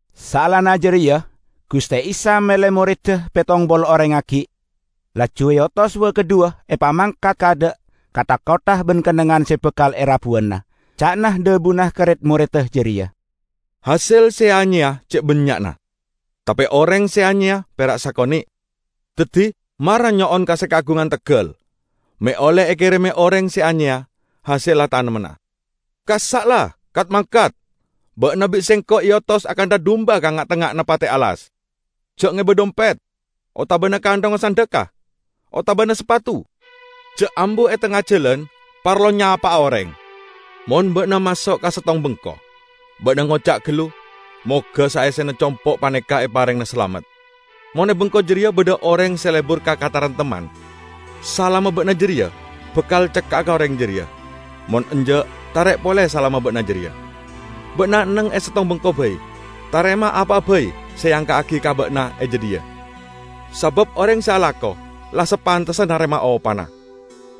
Saellana jareya Guste Isa mele moredda pettong polo oreng aggi', laju eotos wa-kadhuwa epamangkat kaadha' ka tha-kottha ban kennengngan se bakal erabuwana. Ca'na dhabuna ka red-moredda jareya, "Hasel se eanyeya ce' bannya'na, tape oreng se anyeya pera' sakone'. Daddi mara nyo'on ka se kaagungan teggal me' olle ekereme oreng se anyeya hasella tamennanna. Kassa' la kat-mangkat! Ba'na bi' Sengko' eotos akantha dumba ka nga'-tengnga'anna pate' alas. Ja' ngeba dhompet otabana kanthongnga sandhekka, otabana sapatu. Ja' ambu e tengnga jalan parlo nyapa'a oreng. Mon ba'na maso' ka settong bengko, ba'na ngoca' gallu, 'Moga saessena compo' paneka eparengngana salamet.' Mon e bengko jareya badha oreng se lebur ka kataremtemman, salamma ba'na jareya bakal cekka'a ka oreng jareya; mon enja', tarek pole salamma ba'na jareya. Ba'na enneng e settong bengko bai. Tarema apa'a bai se eangka'agi ka ba'na e jadhiya, sabab oreng se alako la sapantessa narema opana.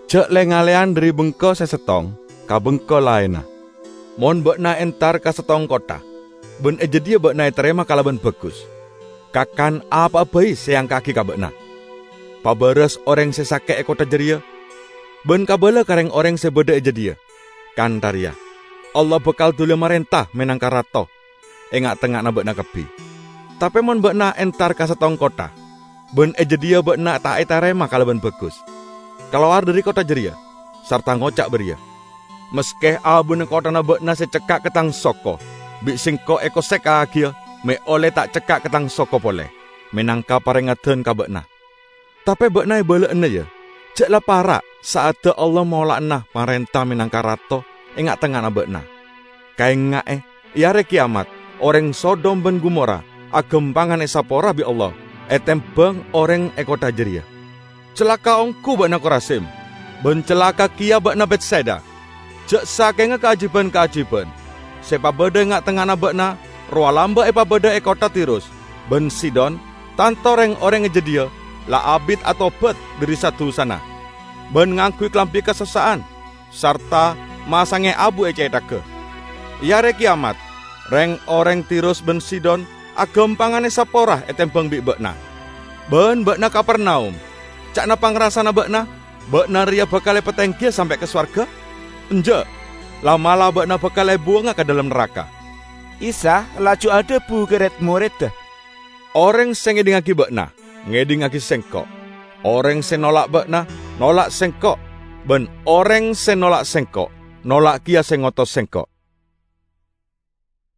Ja' le-ngalleyan dhari bengko se settong ka bengko laenna. Mon ba'na entar ka settong kottha ban e jadhiya ba'na etarema kalaban bagus, kakan apa'a bai se eangka'agi ka ba'na, pabaras oreng se sake' e kottha jareya, ban kabala ka reng-oreng se badha e jadhiya kantha reya, 'Allah bakal duliya marenta menangka Rato e nga'-tengnga'anna ba'na kabbi.' Tape mon ba'na entar ka settong kottha ban e jadhiya ba'na ta' etarema kalaban bagus, kalowar dhari kottha jareya, sarta ngoca' bariya, 'Maske abuna kotthana ba'na se cekka' ka tang soko bi' sengko' ekosekkagiya me' olle ta' cekka' ka tang soko pole, menangka parengeddan ka ba'na. Tape ba'na ebala'ana, ya, ja' la para' sa'adda Allah mola'ana marenta menangka Rato e nga'-tengnga'anna ba'na!' Kaenga'e, e Are Keyamat, oreng Sodom ban Gomora agampangan esapora bi' Allah etembang oreng e kottha jareya." "Calaka' onggu ba'na, Korazim! Ban calaka' keya ba'na, Betsaida! Ja' sakenga kaajiban-kaajiban se epabadha e nga'-tengnga'anna ba'na rowa lamba' epabadha e kottha Tirus ban Sidon, tanto reng-oreng e jadhiya la abit atobat dhari sa-dusana ban ngangguy kalambi kasossa'an sarta masange abu e cethagga. E Are Keyamat reng-oreng Tirus ban Sidon agampangan esapora etembang bi' ba'na. Ban ba'na Kapernaum! Ca'na pangrasana ba'na, ba'na reya bakal epatenggiya sampe' ka sowarga? Enja'! La'-mala' ba'na bakal ebuwanga ka dhalem naraka!" Isa laju adhabu ka red-moredda, "Oreng se ngedhingngagi ba'na, ngedhingngagi Sengko'. Oreng se nolak ba'na, nolak Sengko'. Ban oreng se nolak Sengko', nolak keya se ngotos Sengko'."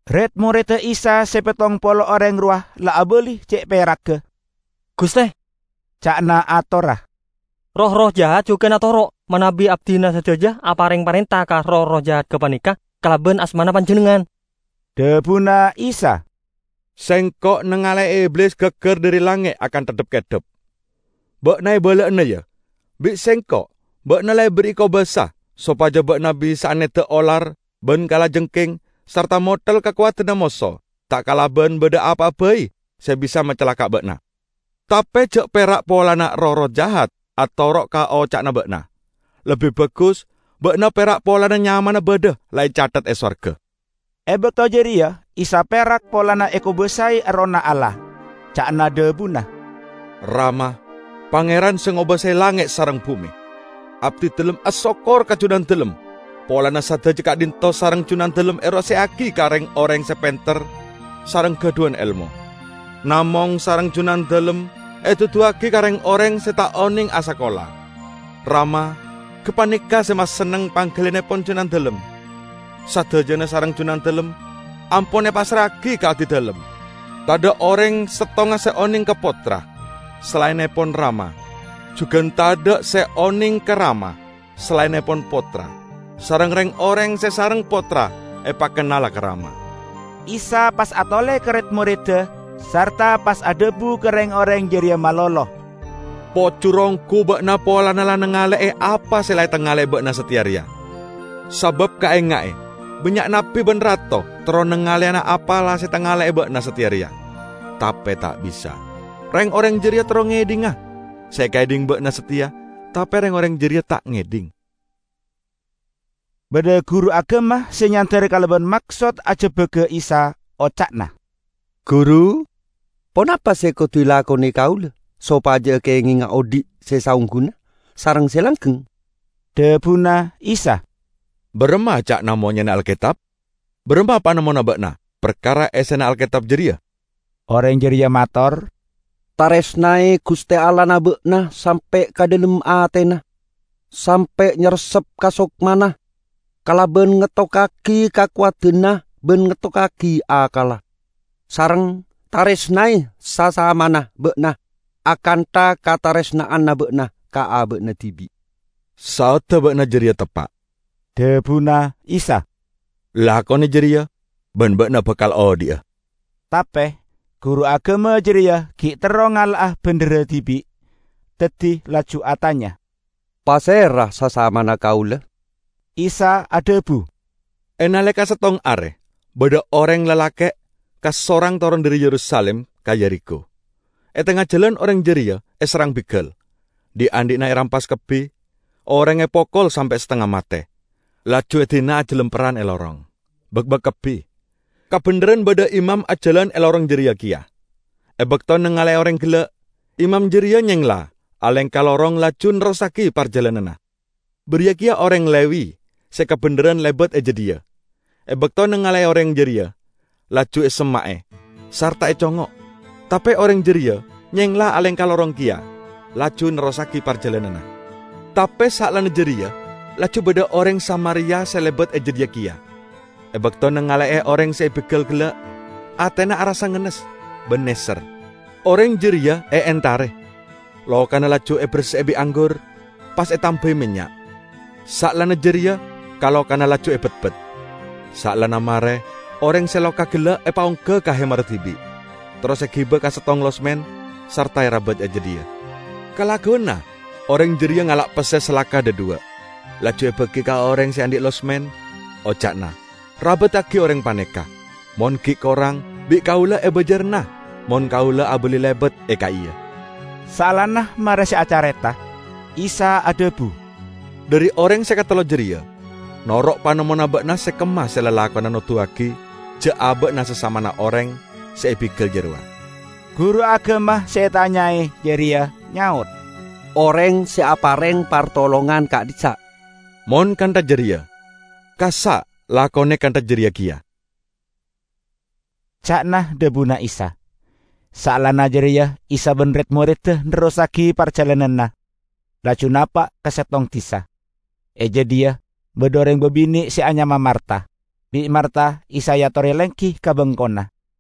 Red-moredda Isa se pettong polo oreng rowa la abali ce' peragga. "Guste," ca'na atorra, "roh-erroh jahat jugan atoro' manabi abdina sadaja apareng parenta ka roh-erroh jahat gapaneka kalaban asmana Panjennengngan!" Dhabuna Isa, "Sengko' nangale'e Iblis gaggar dhari langnge' akantha dhap-keddhap. Ba'na ebala'ana, ya! Bi' Sengko' ba'na la eberri'i kobasa sopaja ba'na bisa'a nedda' olar ban kalajengking sarta motel kakowadanna moso ta' kalaban badha apa'a bai se bisa macalaka' ba'na. Tape ja' perak polana roh-erroh jahat atoro' ka oca'na ba'na. Lebbi bagus ba'na perak polana nyamana badha la ecathet e sowarga." E bakto jareya Isa perak polana ekobasae Errohna Allah. Ca'na dhabuna, "Rama, Pangeran se ngobasae langnge' sareng bume! Abdidalem asokkor ka Junandalem polana sadaja ka'dhinto' sareng Junandalem eroseya'agi ka reng-oreng se penter sareng gadhuwan elmo, namong sareng Junandalem eduduwagi ka reng-oreng se ta' oneng asakola. Rama, gapaneka se masenneng panggaliyannepon Junandalem. Sadajana sareng Junandalem ampon epassra'agi ka Abdidalem. Tadha' oreng settonga se oneng ka Pottra, salaennepon Rama. Jugan tadha' se oneng ka Rama salaennepon Pottra; sareng reng-oreng se sareng Pottra epakennala ka Rama." Isa pas atole ka red-moredda, sarta pas adhabu ka reng-oreng jareya malolo, "Pojur onggu ba'na polana la nangale'e apa se la etangale ba'na sateya reya. Sabab kaenga'e, bannya' nabbi ban rato terro nangaleyana apa se la etangale'e ba'na sateya reya, tape ta' bisa. Reng-oreng jareya terro ngedhinga se ekaedhing ba'na sateya tape reng-oreng jareya ta' ngedhing." Badha guru agama se nyander kalaban maksod ajebbaga Isa. Oca'na, "Guru, ponapa se kodu elakone kaula sopaja kengenga odhi' se saongguna sareng se langgeng?" Dhabuna Isa, "Baramma ca'na monyena Alketab? Baramma panemmona ba'na parkara essena Alketab jareya?" Oreng jareya mator, " 'Taresnae Guste Allahna ba'na sampe' ka dhalem atena, sampe' nyarepsep ka sokmana, kalaban ngettokkagi kakowadanna ban ngettokkagi akkalla,' sareng 'taresnae sasamana ba'na akantha kataresna'anna ba'na ka aba'na dibi'.' " "Saodda ba'na jareya teppa'," dhabuna Isa. "Lakone jareya, ban ba'na bakal odhi'a." Tape guru agama jareya gi' terro ngala'a bendherra dibi'. Daddi laju atanya, "Pasera sasamana kaula?" Isa adhabu, "E naleka settong are badha oreng lalake' kasorang toron dhari Yerusalim ka Yerikho. E tengnga jalan oreng jareya eserrang bigal, dhi'-andhi'na erampas kabbi, orengnga epokol sampe' satengnga mate, laju edina ajalamperran e lorong, bakbak kabbi. Kabendherran badha imam ajalan e lorong jareya keya. E bakto nangale'e oreng gella', imam jareya nyengla alengka lorong laju nerrossagi parjalananna. Bariya keya oreng Lewi se kabendherran lebat e jadhiya; e bakto nangale'e oreng jareya, laju esemma'e sarta econgngo'. Tape oreng jareya nyengla alengka lorong keya laju nerrossagi parjalananna. Tape saellana jareya laju badha oreng Samaria se lebat e jadhiya keya. E bakto nangale'e oreng se ebigal gella', atena arassa ngennes ban neser. Oreng jareya eentare, lokana laju eberse'e bi' anggur pas etambai mennya', saellana jareya ka-lokana laju ebetbet. Saellana mare, oreng se loka gella' epaongga ka hemarra dibi', terros egiba ka settong losmen, sarta erabat e jadhiya. Kalagguwanna oreng jareya ngala' pesse salaka dhadhuwa', laju ebagi ka oreng se andhi' losmen, oca'na, 'Rabaddagi oreng paneka, mon gi' korang, bi' kaula ebajarana mon kaula abali lebat e ka'iya.' " Saellana mare se acareta, Isa adhabu, "Dhari oreng se katello jareya, noro' panemmona ba'na se kemma se lalakonna noduwagi ja' aba'na sasamana oreng se ebigal jarowa?" Guru agama se etanyae jareya nyaot, "Oreng se apareng partolongan ka'dhissa'." "Mon kantha jareya, kassa' lakone kantha jareya keya!" ca'na dhabuna Isa. Saellana jareya Isa ban red-moredda nerrossagi parjalananna, laju napa' ka settong disa. E jadhiya badha oreng babine' se anyama Marta. Bi' Marta Isa eatore lenggi ka bengkona.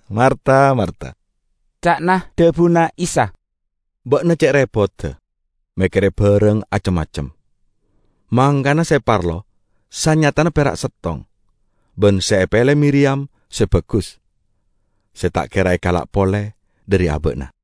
"Marta, Marta!" ca'na dhabuna Isa, "ba'na ce' repodda mekkere barang acem-macem; mangkana se parlo sanyatana pera' settong. Ban se epele Miriyam se bagus, se ta' kera ekala' pole dhari aba'na."